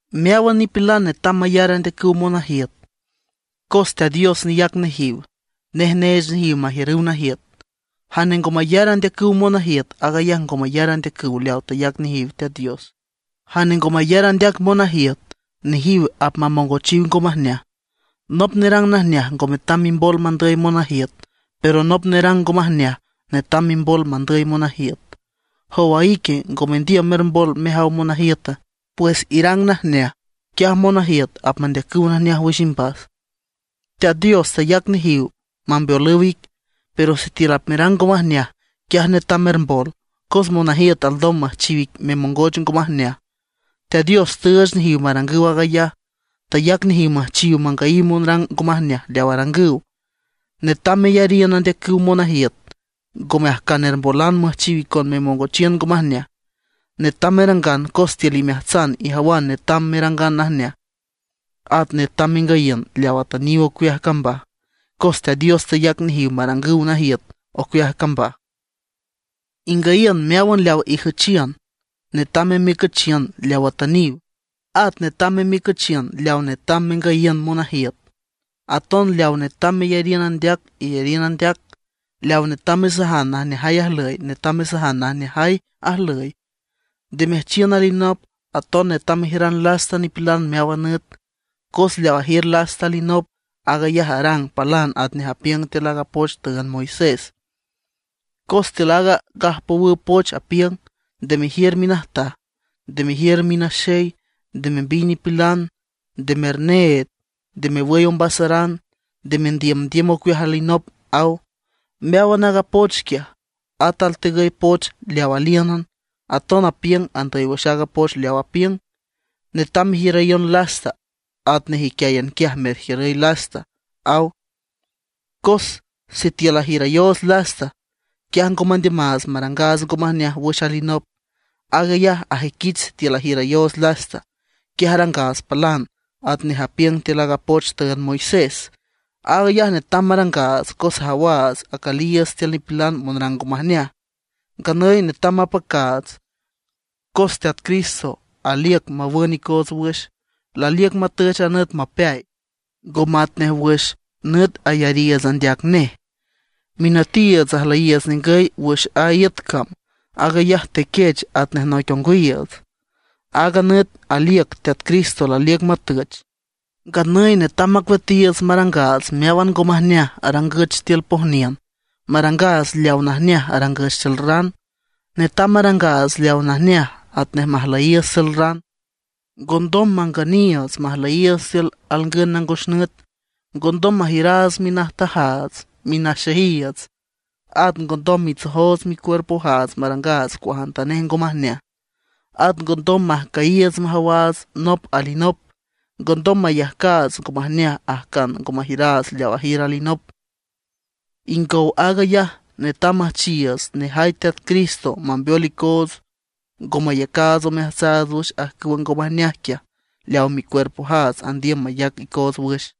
Meáwan nipilan netam mayar andeacüw monajiüt. Cos Teat Dios neyac nejiw, nej neech nejiw majiürüw najiüt. Jane ngo mayar andeacüw monajiüt, aag ayaj ngo mayar andeacüw leaw tayac nejiw Teat Dios. Jane ngo mayar andeac monajiüt, nejiw apmamongochiw ngo majneaj. Nop nerang najneaj ngo metam mimbol mandüy monajiüt; pero nop nerang ngo majneaj netam mimbol mandüy monajiüt. ¿Jowa ique, ngo mendiüm mermbol mejaw monajiüta? Pues irang najneaj, quiaj monajiüt apmandeacüw najneaj wüx imbas. Teat Dios tayac nejiw mambeolüw ic, pero sitiül apmerang ngo majneaj, quiaj netam mermbol; cos monajiüt alndom müjchiw ic memongoch ngo majneaj. Teat Dios tüüch nejiw marangüw aag ayaj; tayac nejiw müjchiw mangüyiw monrang ngo majneaj leaw arangüw. Netam meyariün andeacüw monajiüt, ngome ajcan ermbolan müjchiw icon memongochiün ngo majneaj, netam merangan cos tiül imeajtsan ijawan netam merangan najneaj. At netam mengüyiün leaw atüniw ocueaj cambaj, cos Teat Dios tayac nejiw marangüw najiüt ocueaj cambaj. Ingüyiün meáwan leaw ijüchiün. Netam memiücüchiün leaw atüniw; at netam memiücüchiün leaw netam mengüyiün monajiüt. Aton leaw netam meyariün andeac, iyariün andeac; leaw netam mesajan najneajay ajlüy, netam mesajan najneajay ajlüy. Nde mejüchiün alinop, aton netam mejiüran lasta nipilan meáwan nüt. Cos leaw ajiür lasta alinop, aag ayaj arang palan atnej apiüng tiül aaga poch tüünd Moisés. Cos tiül aaga gajpowüw poch apiüng: “Nde mejiür minajtaj, nde mejiür minaxey, nde membiy nipilan, nde merneed, nde mewüy ombasaran, nde mendiümdiüm ocueaj alinop”, aw. Meáwan aaga poch quiaj, at altegüy poch leaw alíünan, aton apiüng andüy wüx aaga poch leaw apiüng: “Netam mejiürayon lasta atnej iquiáyan quiaj merjiürüy lasta”, aw. Cos sitiül ajiürayoots lasta, quiaj ngo mandiümaats marangaats ngo majneaj wüx alinop. Aag ayaj ajüiquich sitiül ajiürayoots lasta, quiaj arangaats palan atnej apiüng tiül aaga poch tüünd Moisés. Aag ayaj netam marangaats, cos ajawaats acüliiüts tiül nipilan monrang ngo majneaj. Nganüy netam mapacaats, cos Teat Cristo aliüc mawün icoots wüx, laliüc matüch a nüt mapeay, ngo matnej wüx nüt ayariiüts andeac nej. Minütiiüts ajlüyiiüts ningüy wüx a iüt cam, aag ayaj tequech atnej noic ongwiiüts. Aaga nüt aliüc Teat Cristo laliüc matüch. Nganüy netam macueatiiüts marangaats meáwan ngo majneaj arangüch tiül pojniün, marangaats leaw najneaj arangüch tiül ran. Netam marangaats leaw najneaj atnej majlüyiiüts tiül ran. Ngondom mangüniiüts majlüyiiüts tiül alngün nangos nüt, ngondom majiüraats minajtajaats, minaxeyiiüts. At ngondom mitsojoots micuerpojaats, marangaats cuajantanej ngo majneaj. At ngondom majcüyiiüts majawaats nop alinop, ngondom mayajcaats ngo majneaj ajcan ngo majiüraats leaw ajiür alinop. Ingow aag ayaj, netam müjchiiüts nejay Teat Cristo mambeol icoots ngo mayacaats omeajtsaats wüx ajcüwa ngo majneaj quiaj leaw micuerpojaats andiüm mayac icoots wüx.